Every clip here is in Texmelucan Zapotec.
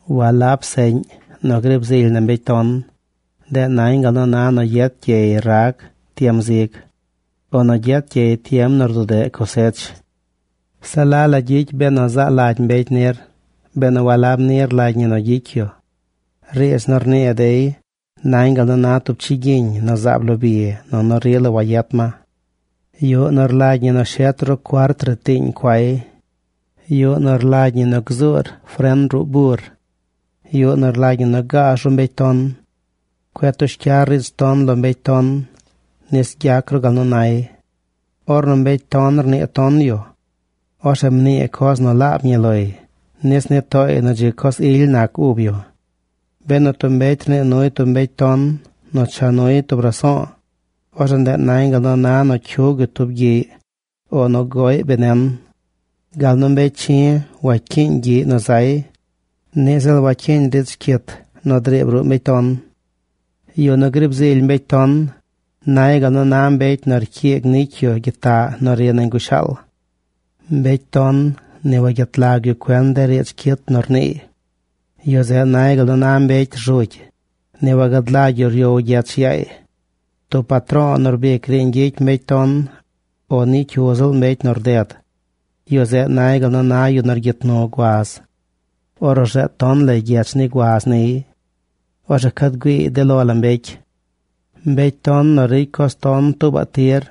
Walab seꞌñ nu griib zily na mbecy ton. Ndeꞌ nañ gal nu na nu gyet gyey rag tiem zig, o nu gyet gyey tiem nu rdudeꞌ cosech. Se la la gyicy benu zaa lagy mbecy nir benu walab ni rlagy ñi nu gyicy yu. Riidz nu rnii dey nañ gal nu na tub chigyiñ nu zaab lo bi nunu rila wayet ma. Yuꞌ nu rlagy ñi nu shet ru cuart ritiiñ cuay. Yuꞌ nu rlagy ñi nu gzuur fren ruꞌ bur. Yuꞌ nu rlagy ñi nu gaaz ru mbecy ton. Cueꞌ tush cyar riidz ton lo mbecy ton nis gyac ru gal nu nay. Ornu mbecy ton rnii ton yu, orzeꞌ mnii coz nu laab ñi loy nis nii tooy nu dzi coz ily nac ub yu. Benu tub mbecy rnii nuy tub mbecy ton nu cha nuy tub raso̱o̱, orzeꞌ ndeꞌ nañ gal nu na nu cyug yu tub gyiꞌy o nu goꞌy benen. Gal nu mbecy chi̱ wacyiiñ gyiꞌy nu gzay, niꞌ ziꞌl wacyiiñ riidz cyit nu driib ruꞌ mbecy ton. Yu nu griib zily mbecy ton nay gal nu na mbecy nu rcyiigy nicy yu gyitaꞌ nu ri nañ gushaal. Mbecy ton ni wagyet lag yu cuen de riidz cyit nu rniiy. Yu zeꞌ nay gal nu na mbecy rzugy. Ni wagad lagy yu ryow gyech yaay. Tub patro̱o̱ nu rbic riiñ gyicy mbecy ton, o ni cyu ziꞌl mbecy nu rded, yu zeꞌ nay gal nu na yu nu rgyit nu guaz. Orzeꞌ rzeed ton lay gyech ni guaz niy. Orzeꞌ cad güiiy de lo la mbecy. Mbecy ton nu ricy coz ton tuubaꞌ tir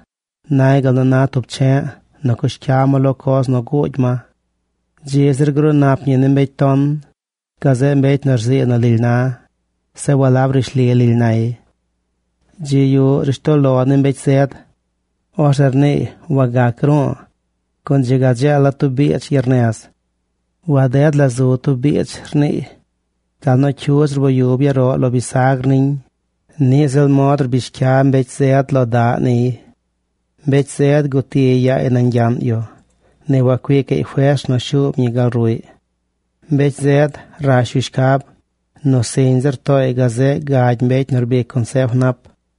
nay gal nu na tub che̱ꞌ nu cush ca ma lo coz nu guugy ma. Dzi zir gruu nap ñi ni mbecy ton gazeꞌ mbecy nu rzii nu lily na, zeꞌ walab rishli lily nay. Dzi yuꞌ rishtoꞌ lo ni mbecy zed. Orzeꞌ rniiy: “Wagac ru̱u̱, gun dzi ga dzeela̱ tub biidz gyernez. Waded la zu tub biidz”, rniiy. Gal nu cyudz rboyub yaroꞌ lo bisagr niñ, niꞌ ziꞌl mod rbish cya mbecy zed lo daꞌ niy. Mbecy zed guti yaay nañ gyaꞌn yu. Ni wacuicaꞌy fers nu shuub ñi gal ruꞌy. Mbecy zed rash yu shcab nu siñ zir tooy gazeꞌ gagy mbecy nu rbic consef nap.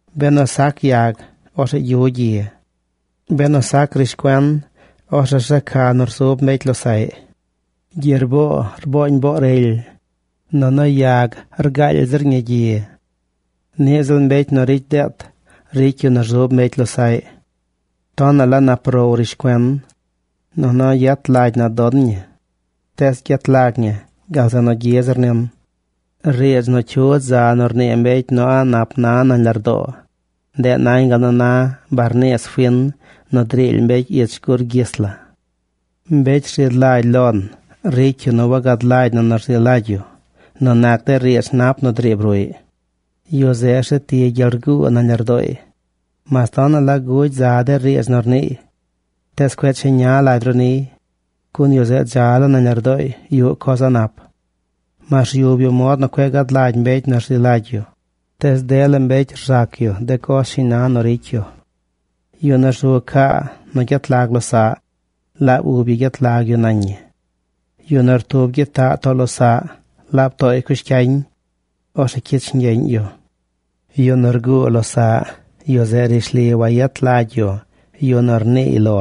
Benu sac yag, orzeꞌ gyu gyi. Benu sac riidz cuen, orzeꞌ rzeca nu rzub mbecy losaꞌy. Gyerboo rbooñ boo rely, nunu yag rgaaly zir ñi gyi. Niꞌ ziꞌl mbecy nu ricy deet ricy yu nu rzub mbecy losaꞌy. Tonaꞌ la nap row rishcuen. Nunu yet lagy na don ñi. Tees gyet lag ñi gal zeꞌ nu gyi zir nin. Riidz nu cyudz za nu rnii mbecy nu a̱ꞌ nap na nañ lardoo, ndeꞌ nañ gal nu na barniis fin nu driily mbecy ich gur gyis la. Mbecy rzi lagy lon ricy yu nu wagad lagy na nu rzi lagy yu nu nac de riidz nap nu driib ruꞌy. Yu zeꞌ rzeti gyel rguu nañ lardooy. Mas tonaꞌ la gugy za de riidz nu rniiy, tees cueꞌ cheña lagy ru niy, gun yu zeꞌ dza laa nañ lardooy yuꞌ coz a̱ꞌ nap. Mas ryub yu mod nu cueꞌ gad lagy mbecy nu rzi lagy yu, tees dela mbecy gzac yu de coz shiñ na nu gyicy yu. Yu nu rzu caa nu gyet lag losaꞌ, laab ub yu gyet lag yu nañ ñi. Yu nu rtub gyitaꞌ too losaꞌ, laab tooy cush cyañ. Orzeꞌ cyich ñgyeꞌñ yu. Yu nu rguu losaꞌ, yu zeꞌ rishli wayet lagy yu yu nu rniiy lo.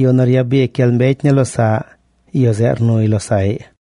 Yu nu ryabic gyel mbecy ni losaꞌ, yu zeꞌ rnuy losaꞌy.